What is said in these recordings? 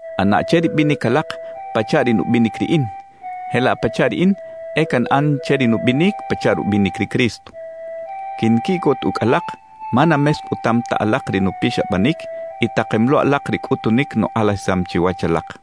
ꞌAna che ri binic alak pachaꞌ ri nubinic riꞌin, jelaꞌ pachaꞌ riꞌin e canꞌan che ri nubinic pachaꞌ rubinic ri Cristo. Quinquiꞌcot ucꞌ alak ma na mescꞌutam ta alak ri nupixabanic y takem lo alak ri cꞌutunic nukꞌalajisam chiwach alak.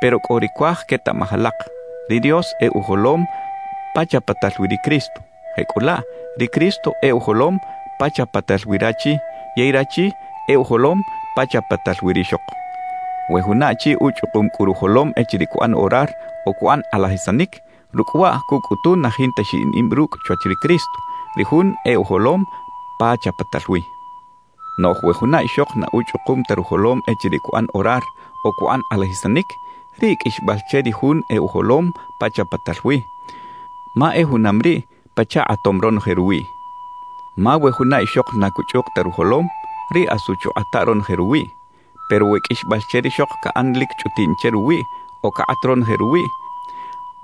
Pero cꞌo ri cuaj quetaꞌmaj alak: Ri Dios e ujolom pa chapatal wi ri Cristo. Jecꞌulaꞌ, ri Cristo e ujolom pa chapatal wi rachi yey rachi e ujolom pa chapatal wi rixok. We juna achi uchꞌukum cꞌu rujolom echiriꞌ cuꞌan orar o cuꞌan kꞌalajisanic, rucꞌ waꞌ cucꞌutu na jinta xiꞌin ib rucꞌ chwach ri Cristo, ri Jun e ujolom pa chapatal wi. Noꞌj we juna ixok na uchꞌukum ta rujolom echiriꞌ cuꞌan orar o cuꞌan kꞌalajisanic, riꞌ qꞌuixbal che ri jun e ujolom pa chapatal wi, ma e junam riꞌ pachaꞌ kꞌatom ronoje ruwiꞌ. Ma we juna ixok na cuchꞌuk ta rujolom, riꞌ asu chukꞌata ronoje ruwiꞌ. Pero we qꞌuixbal che rixok caꞌan lic chꞌutiꞌn che ruwiꞌ o cakꞌat ronoje ruwiꞌ,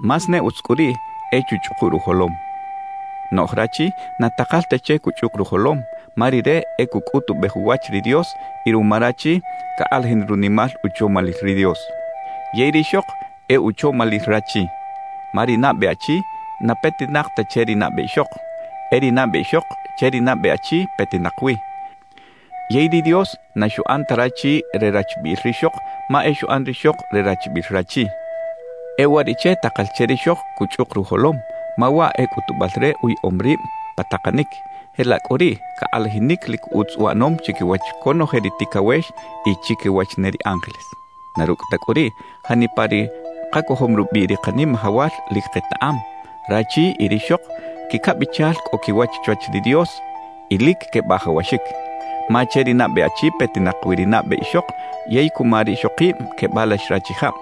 más ne utz cꞌu riꞌ e chuchꞌuku rujolom. Noꞌj rachi na takal ta che cuchꞌuk rujolom, ma rire e cucꞌutubej uwach ri Dios y ruma rachi cakꞌalajin runimal uchomalil ri Dios. Yey rixok e uchomalil rachi. Ma ri nabe achi na petinak ta che ri nabe ixok; e ri nabe ixok che ri nabe achi petinak wi. Yey ri Dios na xuꞌan ta rachi re rachbiꞌil rixok ma e xuꞌan rixok re rachbiꞌil rachi. E uwariꞌche takal che rixok cuchꞌuk rujolom, ma waꞌ e cꞌutubal re uyaꞌom rib pa takanic, jelaꞌ cꞌu riꞌ cakꞌalajinic lic utz uꞌanom chiquiwach conoje ri ticawex y chiquiwach ne ri ángeles. Na rucꞌ ta cꞌu riꞌ, janipa ri kacojom rubiꞌ ri Kanimajawal lic ketaꞌam, rachi y rixok quicabichal cꞌo quiwach chwach ri Dios y lic quebajawaxic. Ma che ri nabe achi petinak wi ri nabe ixok yey cuma rixokib quebalax rachijab.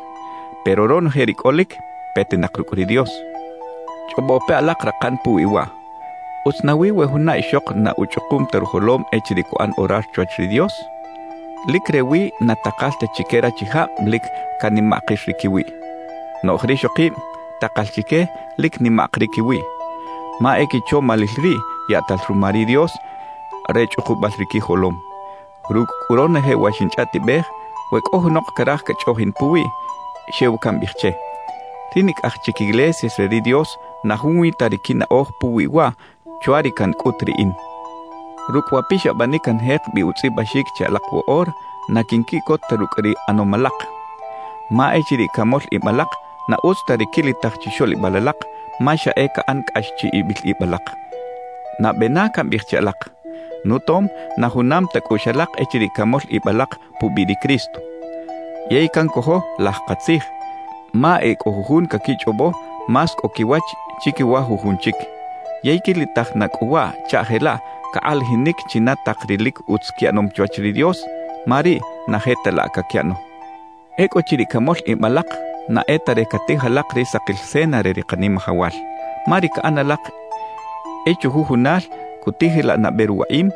Pero ronoje ri cꞌolic, petinak rucꞌ ri Dios. Chꞌobo pe alak rakan puwi waꞌ: ¿Utz nawi we juna ixok na uchꞌukum ta rujolom echiriꞌ cuꞌan orar chwach ri Dios? Lic rewi na takal ta chique rachijab lic canimaꞌkir ri quiwiꞌ. Noꞌj rixokib takal chique lic nimaꞌk ri quiwiꞌ, ma e quichomalil riꞌ yaꞌtal ruma ri Dios re chꞌukubal ri quijolom. Rucꞌ cꞌu ronoje wa xinchꞌaꞌtibej, we cꞌo junok caraj cachꞌoꞌjin puwiꞌ, xew cambiꞌij che: Ri nicꞌaj chic iglesias re ri Dios na junwi ta ri quinaꞌoj puwi waꞌ chwa ri cancꞌut riꞌin. Rucꞌ wa pixabanic canjek bi utzꞌibaxic che alak woꞌora, na quinquiꞌcot ta rucꞌ ri ꞌanom alak. Ma echiriꞌ camol ib alak, na utz ta ri quilitaj chixoꞌlibal alak, ma xa e caꞌan cꞌax chiꞌibil ib alak. Nabe na cambiꞌij che alak, nutom na junam ta cꞌuꞌx alak echiriꞌ camol ib alak pubiꞌ ri Cristo. Yey cancojo laj katzij, ma e cꞌo jujun caquichꞌobo más cꞌo quiwach chiquiwa jujun chic. Yey quilitaj na cꞌu waꞌ chaꞌ jelaꞌ cakꞌalajinic china tak ri lic utz quiꞌanom chwach ri Dios, ma riꞌ na je ta laꞌ caquiꞌano. Ecꞌuchiriꞌ camol ib alak, na e ta re catij alak ri sakil cena re ri Kanimajawal. Ma ri caꞌan alak e chujujunal cutijilaꞌ nabe ruwaꞌim,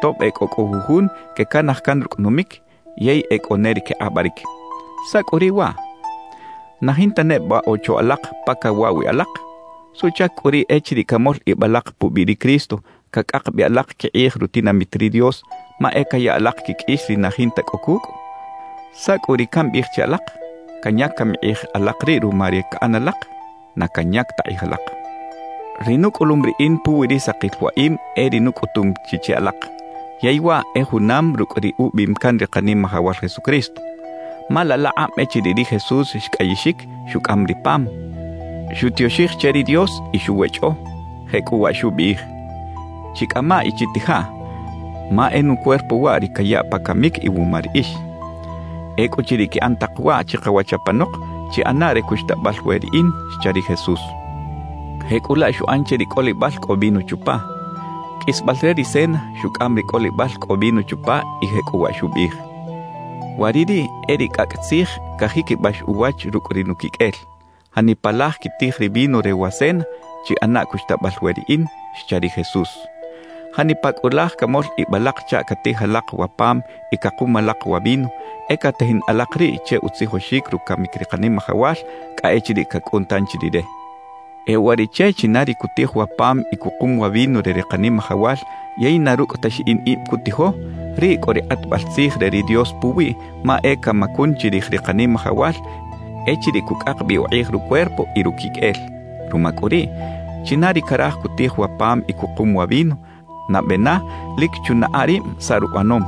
tob e cꞌo cꞌu jujun quecanaj can rucꞌ numic yey e cꞌo ne ri quekꞌabaric. ¿Saꞌ cꞌu riꞌ waꞌ? ¿Na jinta neba ocho alak pa cawaꞌ wi alak? ¿Suꞌchac cꞌu riꞌ echiriꞌ camol ib alak pubiꞌ ri Cristo, cacꞌak bi alak quikꞌij rutinamit ri Dios; ma e caya alak quiqꞌuix ri na jinta cꞌo cucꞌ? ¿Saꞌ cꞌu ri cambiꞌij che alak? ¿Canyac cami kꞌij alak riꞌ ruma ri caꞌan alak? ¡Na canyac ta kꞌij alak! Ri nucꞌulum riꞌin puwi ri sakil waꞌim e ri nucꞌutum chi che alak, yey waꞌ e junam rucꞌ ri ubiꞌim can ri Kanimajawal Jesucristo. Ma laꞌ laꞌkꞌab echiriꞌ ri Jesús xcꞌayixic, xucꞌam ri pam, xutioxij che ri Dios y xuwechꞌo, jecꞌuwaꞌ xubiꞌij: «Chicꞌamaꞌ y chitijaꞌ, ma e nucuerpo waꞌ ri cayaꞌ pa camic iwuma riꞌix. Ecꞌuchiriꞌ quiꞌan tak waꞌ chikawach apanok, chiꞌanaꞌ re cuxtabal we riꞌin» xcha ri Jesús. Jecꞌulaꞌ xuꞌan che ri cꞌolibal cꞌo vino chupa. Qꞌuisbal re ri cena, xucꞌam ri cꞌolibal cꞌo vino chupa y jecꞌuwaꞌ xubiꞌij: «Wa ri riꞌ e ri cꞌacꞌ tzij cajiquibax uwach rucꞌ ri nuquiqꞌuel. Janipa laj quitij ri vino re wa cena, chiꞌanaꞌ cuxtabal we riꞌin» xcha ri Jesús. Janipa cꞌu laj camol ib alak chaꞌ catij alak wa pam y cakum alak wa vino, e catajin alak riꞌ che utzijoxic rucamic ri Kanimajawal cꞌa echiriꞌ cacꞌun tanchi Rire. E uwariꞌche china ri cutij wa pam y cukum wa vino re ri Kanimajawal yey na rucꞌ ta xiꞌin ib cutijo, riꞌ cꞌo ri kꞌatbal tzij re ri Dios puwiꞌ ma e camacun chirij ri Kanimajawal echiriꞌ cucꞌak bi ukꞌij rucuerpo y ruquiqꞌuel. Ruma cꞌu riꞌ, china ri caraj cutij wa pam y cukum wa vino, nabe na lic chunaꞌa rib saꞌ ruꞌanom.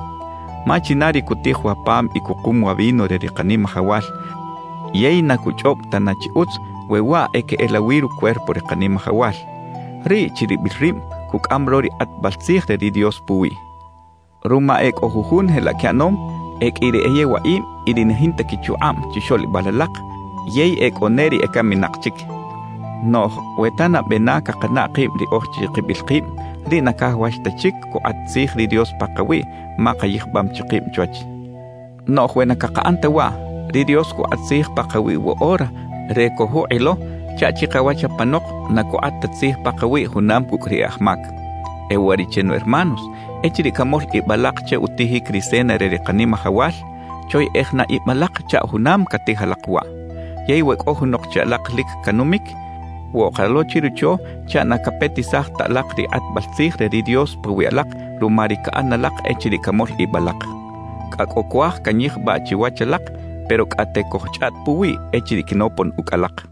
Ma china ri cutij wa pam y cukum wa vino re ri Kanimajawal yey na cuchꞌob tana chi utz we waꞌ e queꞌelawi rucuerpo ri Kanimajawal; riꞌ chiribil rib cucꞌam lo ri kꞌatbal tzij re ri Dios puwiꞌ. Ruma e cꞌo jujun jelaꞌ quiꞌanom, e qꞌui ri e yewaꞌib y ri na jinta quichukꞌab chixoꞌlibal alak, yey e cꞌo ne ri ecaminak chic. Noꞌj we ta nabe na cakanaꞌ kib riꞌoj chikibil kib, riꞌ na cajawax ta chic cukꞌat tzij ri Dios pakawiꞌ ma kayijbam chi kib chwach. Noꞌj we na cakaꞌan ta waꞌ, ri Dios cukꞌat tzij pakawiꞌ woꞌora re cojukꞌilo chaꞌ chikawach apanok na cukꞌat ta tzij pakawiꞌ junam cucꞌ ri e aj mac. E uwariꞌche nu hermanos, echiriꞌ camol ib alak che utijic ri cena re ri Kanimajawal, choyeꞌej na ib alak chaꞌ junam catij alak waꞌ. Yey we cꞌo junok che alak lic canumic, woꞌka lo chirocho chaꞌ na capetisaj ta alak ri kꞌatbal tzij re ri Dios pawiꞌ alak ruma ri caꞌan alak echiriꞌ camol ib alak. Cꞌa cꞌo cuaj canyijbaꞌ chiwach alak, pero cꞌate cojchꞌaꞌt puwiꞌ echiriꞌ quinopon ucꞌ alak.